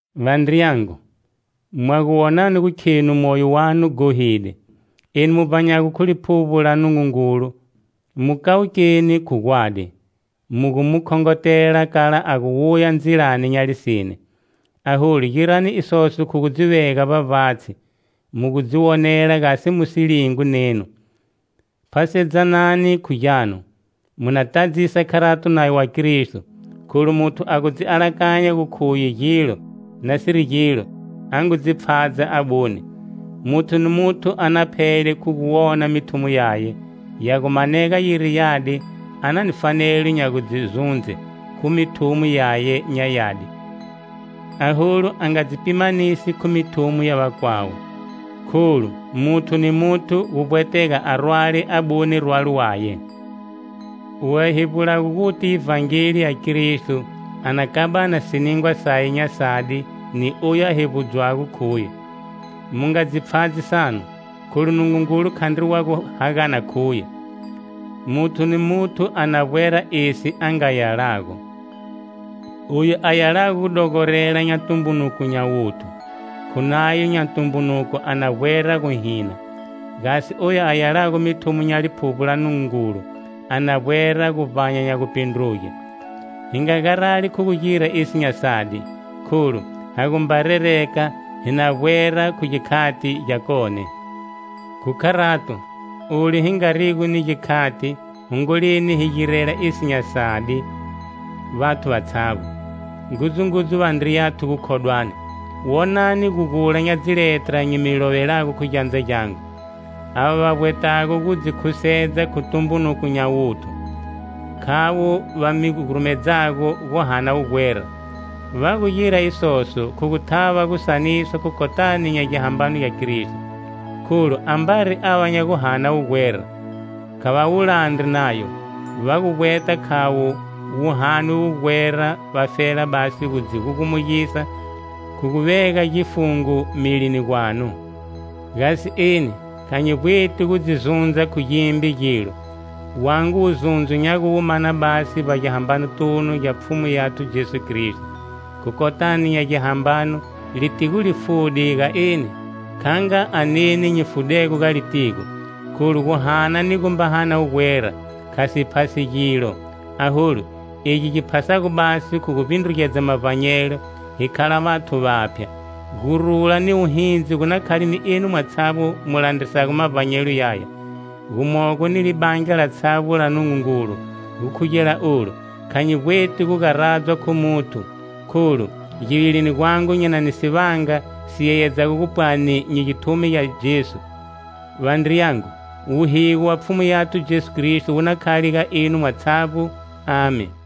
Vandriyangu, mwa gu wonani gu khenu moyo wanu ghohide, enu mu vbanyago khu Liphuvbo la Nungungulu mu kawukeni khu gwadi, mu gu mu khongotela kala a gu wuya ndzilani nya lisine. Aholu girani isoso khu gu dzi vega vbavbatshi, mu gu dzi wonela gasi mu si lingwi nenu. Phasedzanani khu gyanu, mu na tadzisa kharato nayo wa Kristo. Kholu muthu a gu dzi alakanya gu khuye gilo, nasiri gilo, a ngu dzi pfhadza abune. Muthu ni muthu a na phele khu guwona mithumo yaye. Ya gu manega yiri yadi a na ni fanelo nya gu dzi zundze khu mithumo yaye nya yadi, aholu a nga dzi pimanisi khu mithumo ya vakwawe, kholu, muthu ni muthu gu vbweta a rwale abune rwalo waye. Oyu a hevbulago guti Ivhangeli ya Kristo a na kabana siningwa saye nya sadi ni oyu a hevbudzwago khuye. Mu nga dzi pfhadzini sanu; kholu Nungungulu khandri wa gu hagana khuye. Muthu ni muthu a na vbwera esi a nga yalago. Oyu a yalago gudogorela nya tumbunuko nya wuthu, khu nayo nya tumbunuko a na vbwera guhina. Gasi oyu a yalago mithumo nya Liphuvbo la Nungungulu, a na vbwera guvbanya nya gupindruge. Hi nga garali khu gu gira esi nya sadi. Kholu, ha gumba rereka, hi na vbwera khu gikhati gyakone. Khu kharato, olu hi ngarigo ni gikhati, hongoleni hi girela esi nya sadi vathu vatshavbo, ngudzungudzu vandriyathu gukhodwani. Wonani gugula nya dziletra nyi mi lovelago khu gyandza gyangu. Ava va vbwetago gu dzi khusedza khu tumbunuko nya wuthu, khavo va mi gurumedzago guhana wugwera. Va gu gira isoso khu gu thava gu saniswa khu kotani nya gihambano gya Kristo. Kholu ambari ava va nya guhana wugwera, kha va wu landri nayo. Va gu vbweta khavo mu hane wugwera vafela basi gu dzi gugumugisa khu gu vega gifungo milini gwanu. Gasi eni, kha nyi vbweti gu dzi zundza khu gimbe gilo; wangu wuzundzo nya gu wu mana basi vbagihambanotunu gya Pfhumu yathu Jesu Kristo. Khu kotani nya gihambano litigo li fude ga eni, kha nga aneni nyi fudego ga litigo. Kholu guhana ni gumba hana wugwera kha si phasi gilo; aholu, egi gi phasago basi khu gu vbindrugedza mavbanyelo, hi khala vathu vaphya. Gurula ni wuhindzi gu na khale ga enu mwatshavbo mu landrisago mavbanyelo yaya, gumogo ni libandla latshavbo la Nungungulu. Gukhugela olu, kha nyi vbweti gu garadzwa khu muthu, kholu, givilini gwangu nyi na ni sivanga si yeyedzago gupwani nyi githumi gya Jesu. Vandriyangu, wuhigo wa Pfhumu Yathu Jesu Kristo wu na khale ga enu mwatshavbo. Amen.